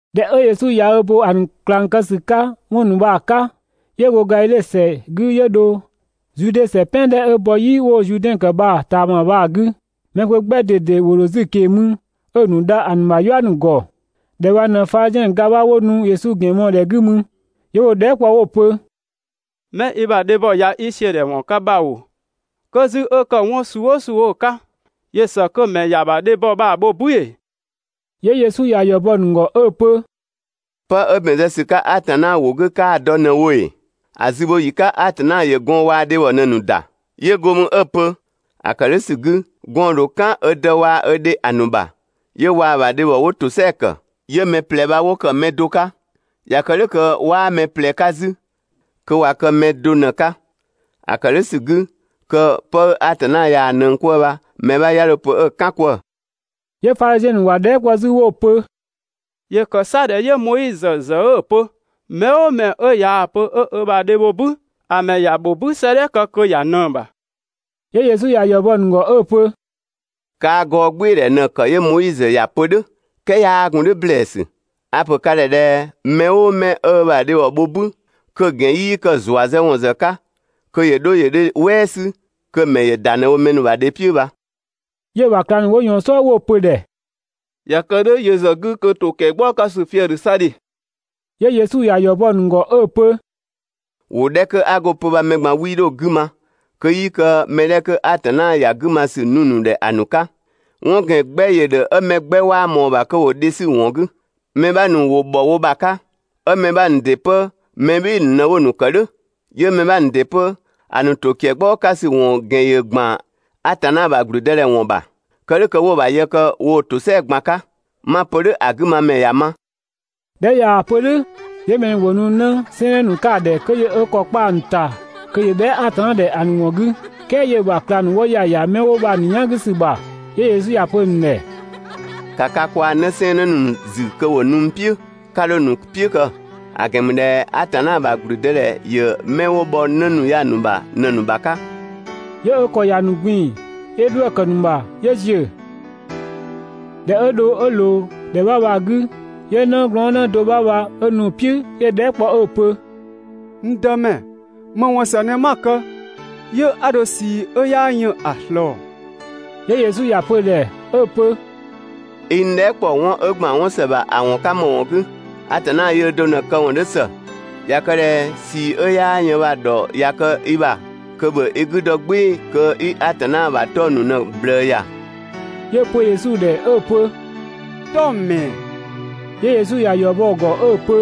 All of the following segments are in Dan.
꞊Dhɛ 'ö Yesu ꞊ya bo ‑a ‑nu ꞊klang kë ‑sü 'ka 'wɔn ‑nu bha‑ 'ka, 'yö go Gadhidhe ‑sɛ 'gü 'yö dho Zude ‑sɛ "pɛan 'dhɛ 'ö bɔ "yi 'wo‑ Zuudɛn ‑kë bha‑ ꞊taama bha‑ 'gü. Mɛ kpö 'gbɛ ꞊dede ‑wo ‑dho 'zü‑ ꞊keng‑ mü 'ö‑ ‑nu dha ‑a ‑nu ‑bha "yua ‑nu ‑gɔ. ‑Dhɛ bha ꞊në Fadhiziɛn ‑nu ga 'bha 'wo nu Yesu ‑gɛn mɔɔ‑ ‑dhɛ 'gü mü, 'yö 'wo‑ dhɛɛ" kpɔ 'wo‑ pö: «'Mɛ i ‑bha dhebhɔ ꞊ya i ‑siödhɛwɔn kë bha ‑oo, 'kö 'zü 'ö ‑kë 'wɔn suu "ʋʋ suu 'ö‑ 'ka, ‑yö ‑së kö‑ ‑mɛ ‑ya ‑bha dhebhɔ bha‑ bho "bü ‑ee? 'Yö Yesu ‑ya ‑yɔ bɔ‑ ‑nu ‑gɔ 'ö‑ pö: «'Pë 'ö ‑bɛn zë ‑sü 'ka Atanna ‑wʋ 'gü 'kaa‑ dɔ ꞊në wo ‑ee? ‹‑A zübhoyi 'ka Atanna ‑yö gɔɔn‑ waa‑ dhebhɔ ꞊në‑ ‑nu ‑da.› 'Yö go mü 'ö‑ pö: ‹‑A ‑kë "dhʋ̈ ‑sü 'gü, gɔɔn‑ ‑dho "kan ö dë waa‑ ö dhe ‑a ‑nu ‑bha, 'yö waa‑ ‑bha dhebhɔ 'wo ‑tosɛa ‑kë, 'yö wɛng 'wo ‑kë pë do 'ka.› ꞊Ya kë "dhʋ̈ kö dhe waa‑ gɔn 'wo bha 'waa mɛ ꞊plɛ 'ka 'zü, kö ꞊wa kë pë do ꞊në‑ 'ka. ‑A ‑kë "dhʋ̈ ‑sü 'gü kö 'pë 'ö Atanna ꞊yaa‑ ꞊nëng 'kwëë‑ bha, mɛ 'bha 'ya 'dho‑ pö 'ö‑ "kan 'kwëë‑.» 'Yö Fadhiziɛn ‑nu ‑wa dhɛɛ" kpɔ 'zü 'wo‑ pö: «‑Yö ‑kë 'sa ꞊dhɛ 'yö Moizö ‑zë 'ö‑ pö mɛ "ʋʋ mɛ 'ö ꞊yaa‑ pö 'ö dhe bho "bü, ‑a ‑mɛ ‑ya ‑bho "bü 'sëëdhɛ kë kö ‑ya ꞊nëng‑ ‑bha?» 'Yö Yesu ‑ya ‑yɔ bɔ‑ ‑nu ‑gɔ 'ö‑ pö: «Kaa‑ gɔɔgbɩɩdhɛ bha ꞊në‑ ‑kë 'yö Moizö ‑ya pö "dhʋ̈, "kɛɛ 'yaa gun "dhʋ̈ ‑blɛɛsü. A‑ ‑pö ka ‑dhɛ ꞊dhɛ: Mɛ "ʋʋ mɛ 'ö ö ‑bha dhebhɔ bho "bü, kö‑ ‑gɛn 'yii kë‑ ‑zuazëwɔn ‑zë 'ka, kö ‑yö 'dho ‑yö dhe "wɛɛ 'sü, kö‑ ‑mɛ ‑yö ‑da ꞊në wo mɛ ‑nu ‑bha dhe "piʋ̈ bha.» 'Yö‑ ‑bha ꞊klang ‑nu 'wo ꞊yɔɔn‑ "sɔɔ 'wo‑ pö‑ ‑dhɛ: «꞊Ya kë "dhʋ̈ yö ‑zë 'gü kö ‑to ‑kiɛgbaɔ 'ka ‑sü fië‑ ‑dhö 'sa ‑dhe.» 'Yö Yesu ‑ya ‑yɔ bɔ‑ ‑nu ‑gɔ 'ö‑ pö: «‑Wʋ 'dhɛ 'kö 'a go‑ pö bha mɛ ꞊gban 'wii 'dho yö ‑zë 'gü ma, kö 'yii kë mɛ 'dhɛ 'kö Atanna ‑ya 'gü ma ‑sü nu‑ ‑nu ‑dhɛ ‑a ‑nu 'ka. 'Wɔn ‑gɛn 'gbɛ ‑yö ‑dhö 'ö mɛ 'gbɛ 'waa ꞊mɔɔ‑ ‑bha kö ‑wo dhe 'sü‑ ‑wɔn 'gü. Mɛ 'bha ‑nu ‑wo ‑bhɔ wo ‑bha 'ka, 'ö mɛ 'bha ‑nu ‑dɩ 'pö mɛ "bhɩɩ‑ ‑nu ꞊në 'wo‑ ‑nu ‑kë "dhʋ̈. 'Yö‑ mɛ 'bha ‑nu ‑dɩ 'pö, ‑a ‑nu ‑to ‑kɛgbaɔ 'ka ‑wɔn ‑gɛn 'dhö ‑gban Atanna ‑bha ‑gblüdëdhɛ ‑wɔn ‑bha. Kë "dhʋ̈ kö 'wo‑ ‑bha yë kë woo‑ ‑tosɛa ꞊gban 'ka. 'Ma‑ pö "dhʋ̈, ‑a 'gü ma ‑mɛ ‑ya ma!» ꞊Dhɛ 'ö ꞊yaa‑ pö "dhʋ̈, 'yö mɛ ‑nu ‑wo nu 'në 'sɛɛnnë ‑nu 'ka‑ ‑dhɛ kö ‑yö ö ‑kɔ kpa ‑a ‑nu ‑ta kö ‑yö bhɛa" Atanna ‑dhɛ ‑a ‑nu ‑wɔn 'gü, "kɛɛ 'yö‑ ‑bha ꞊klang ‑nu 'wo ‑ya ‑ya 'mɛ 'wo bha‑ ‑nu "yan 'gü ‑sü ‑bha. 'Yö Yesu ‑ya pö‑ ‑nu ‑dhɛ: «‑Ka ka kwaa‑ 'nësɛɛnnë ‑nu ‑zü kö ‑wo nu n "piʋ̈ 'ka 'dho ‑a ‑nu "piʋ̈ kë, ‑a ‑gɛn ‑mü ꞊dhɛ Atanna ‑bha ‑gblüdëdhɛ ‑yö 'mɛ 'wo bhɔ 'në ‑nu ya‑ ‑nu ‑bha ꞊në‑ ‑nu ‑bha 'ka.» 'Yö ö ‑kɔ ‑ya ‑nu ꞊gbin‑, 'yö 'dhuë‑ ‑kë ‑nu ‑bha 'yö ‑ziö. ꞊Dhɛ 'ö dho 'ö ꞊loo ‑dhɛ 'bha bha‑ 'gü, 'yö 'nëglɔɔnnë do 'bha bha 'ö nu‑ "piʋ̈ 'yö‑ dhɛɛ" kpɔ 'ö‑ pö: «N Dëmɛ, ‑më ‑wɔn ‑së ꞊në 'ma‑ kë 'yö 'a dho ꞊sii 'ö 'yaa yën ‑a ꞊slɔɔ?» 'Yö Yesu ‑ya pö‑ ‑dhɛ 'ö‑ pö: «I n dhɛɛ" ‑kpɔ 'wɔn 'ö ‑gban 'wɔn ‑së ‑bha ‑a ‑wɔn 'ka ‑më ‑wɔn 'gü? Atanna yöö do ꞊në‑ këwɔn 'dhö ‑së. ꞊Ya kë ꞊dhɛ ꞊sii 'ö 'yaa yën bha‑ ‑dhɔ ꞊ya kë i ‑bha kö ‑bhö i 'gü dɔ "gbɩɩ‑ kö 'i Atanna ‑bha 'tɔng‑ ‑nu ꞊në‑ ꞊bhlëë ‑ya!» 'Yö‑ pö Yesu ‑dhɛ 'ö‑ pö: «'Tɔng‑ ‑mɛɛ?» 'Yö Yesu ‑ya ‑yɔ bɔ‑ ‑gɔ 'ö‑ pö: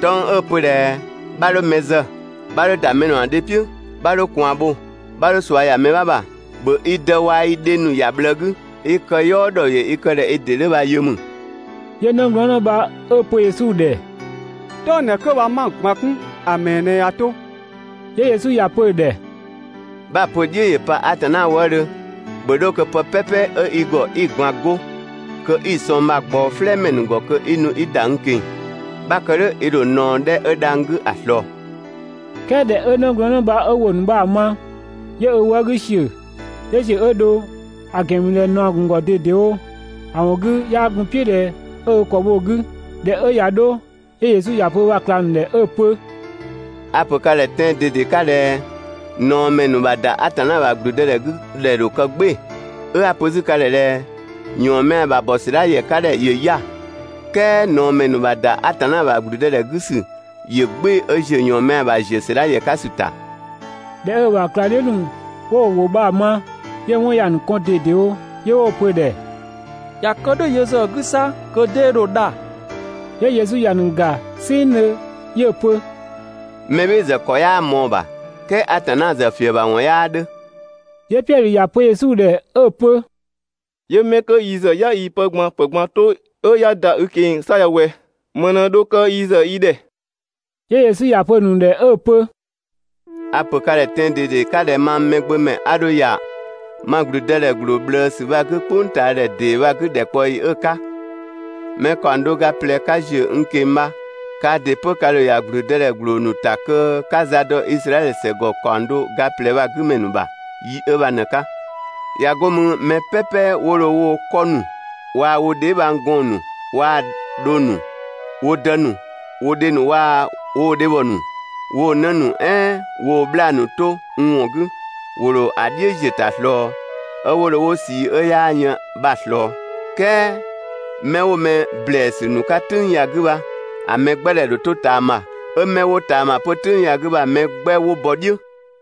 «'Tɔng‑ 'ö‑ pö ꞊dhɛ: ‹'Bha 'dho mɛ zë, 'bha 'dho ‑da mɛ ‑nu ‑bha dhe "piʋ̈, 'bha 'dho ꞊kwaan bho, 'bha 'dho ꞊sua ‑ya mɛ 'bha ‑bha, ‑bhö i dë waa‑ i dhe‑ ‑nu ‑ya ꞊bhlëë 'gü, i këyɔɔ ‑dhɔ ‑yö i kë ꞊dhɛ i ‑dɩ 'dhö bha‑ yö.›» 'Yö 'nëglɔɔnnë bha 'ö‑ pö Yesu ‑dhɛ: «'Tɔng‑ 'dhɛ 'kö bha 'ma‑ ꞊gban 'kun, ‑a ‑mɛɛ ꞊në ꞊ya 'to?» 'Yö Yesu ‑ya pö‑ ‑dhɛ: «'Bha‑ pö‑ "dhiʋ̈ ‑yö pa Atanna wëëdhö, ‑bhö 'dho kö pë "pɛpɛ 'ö i ‑gɔ 'i‑ ꞊gban 'go, kö 'i‑ sɔng bha‑ ꞊gbaɔ "flɛɛmɛ ‑nu ‑gɔ kö 'i nu 'i ‑da n ꞊keng‑. 'Bha‑ kë "dhʋ̈ i ‑dho ꞊naɔ 'dhɛ 'ö dhang‑ 'gü ‑a ꞊slɔɔ.» "Kɛɛ ꞊dhɛ 'ö 'nëglɔɔnnë bha 'ö ‑wʋ ‑nu bha‑ ma, 'yö ö wë 'gü ‑siö, 'yö ‑ziö 'ö dho, ‑a ‑gɛn ‑mü ꞊dhɛ ꞊naɔ‑ ‑gun ‑gɔ ꞊dedewo, (‑a ‑wɔn 'gü, 'yaa gun‑ "piʋ̈ ꞊dhɛ 'ö ö ‑kɔ bho‑ 'gü). ꞊Dhɛ 'ö ꞊ya 'dho, 'yö Yesu ‑ya pö ö ‑bha ꞊klang ‑nu ‑dhɛ 'ö‑ pö: «A‑ ‑pö ka ‑dhɛ tɛan‑ ꞊dede 'ka ꞊dhɛ: ꞊Naɔmɛ ‑nu ‑bha ‑da Atanna ‑bha ‑gblüdëdhɛ 'gü ‑dhɛ ‑dho kë "gbɩɩ‑. 'Ö 'a‑ pö 'zü ka ‑dhɛ ꞊dhɛ: ‑Yɔɔnmɛa ‑bha bɔ ‑sɛdha ‑yɛ 'ka ‑dhɛ ‑yö 'ya‑, "kɛɛ ꞊naɔmɛ ‑nu ‑bha ‑da Atanna ‑bha ‑gblüdëdhɛ 'gü ‑sü ‑yö "gbɩɩ‑ 'ö ‑ziö ‑yɔɔnmɛa ‑bha ‑ziö ‑sɛdha ‑yɛ 'ka ‑sü ‑ta.» ꞊Dhɛ 'ö‑ ‑bha ꞊klangdhiʋ̈ ‑nu 'wo ‑wʋ bha‑ ma, 'yö‑ 'wɔn ‑ya ‑nu kɔn ꞊dedewo 'yö 'wo‑ pö‑ ‑dhɛ: «꞊Ya kë "dhʋ̈ yö ‑zë 'gü 'sa kö 'dee dho dha?» 'Yö Yesu ‑ya ‑nu ‑ga "sɛnngdhö, 'yö‑ pö: «Mɛ "bhɩɩ‑ ‑zë ‑kɔ 'yaa ꞊mɔɔ‑ ‑bha, "kɛɛ Atanna ‑zë ‑fiëbhawɔn 'yaa 'dhö.» 'Yö Piɛdhö ‑ya pö Yesu ‑dhɛ 'ö‑ pö: «'Yö 'mɛ 'kö yi ‑zë 'ya yii‑ pë ꞊gban ‑pë ꞊gban 'to, 'ö 'ya ‑da i ꞊keng‑ 'sa ya ꞊wɛ, ‑më ꞊në dho kë yi ‑zë yi ‑dhɛ?» 'Yö Yesu ‑ya pö‑ ‑nu ‑dhɛ 'ö‑ pö: «A‑ ‑pö ka ‑dhɛ tɛan‑ ꞊dede 'ka ꞊dhɛ mang Mɛgbömɛ 'a dho ‑ya ma ‑gblüdëdhɛ ‑gbloo ꞊bhlëësü bha‑ 'gü "kpʋngtaadhɛ ‑dee bha‑ 'gü ‑dhɛkpaɔyi 'ö‑ 'ka, mɛ ‑kaɔng do ga ꞊plɛ 'ka ‑ziö n ꞊keng‑ bha, kaa ‑dɩ 'pö ka ‑dho ‑ya ‑gblüdëdhɛ ‑gbloo ‑nu ‑ta kö 'ka za dɔ Izraɛdhö "sɛgɔ ‑kaɔng do ga ꞊plɛ bha‑ 'gü ‑mɛ ‑nu ‑bha yi 'ö bha ꞊në‑ 'ka. ꞊Ya 'go mü mɛ "pɛpɛ 'wo dho woo‑ 'kɔ ‑nu waa‑ wo dheebhang gɔɔn‑ ‑nu waa‑ dhong ‑nu, wo dë ‑nu, wo dhe ‑nu waa‑ woo‑ dhebhɔ ‑nu, woo‑ 'në ‑nu "ɛɛn woo‑ 'bhlaa‑ ‑nu 'to n ‑wɔn 'gü, ‑wo ‑dho ‑a "dhiʋ̈ ‑ziö ‑ta ꞊slɔɔ, 'ö 'wo dho 'wo ꞊sii 'ö 'yaa yën bha‑ ꞊slɔɔ. "Kɛɛ 'mɛ 'wo mɛ ‑blɛɛsü ‑nu 'ka "tʋ̈ng ya‑ 'gü bha, ‑a mɛ 'gbɛ ‑dhɛ ‑dho 'to ꞊taama, 'ö 'mɛ 'wo ꞊taama 'pö "tʋ̈ng ya‑ 'gü bha‑ mɛ 'gbɛ 'wo bɔ "dhiʋ̈.»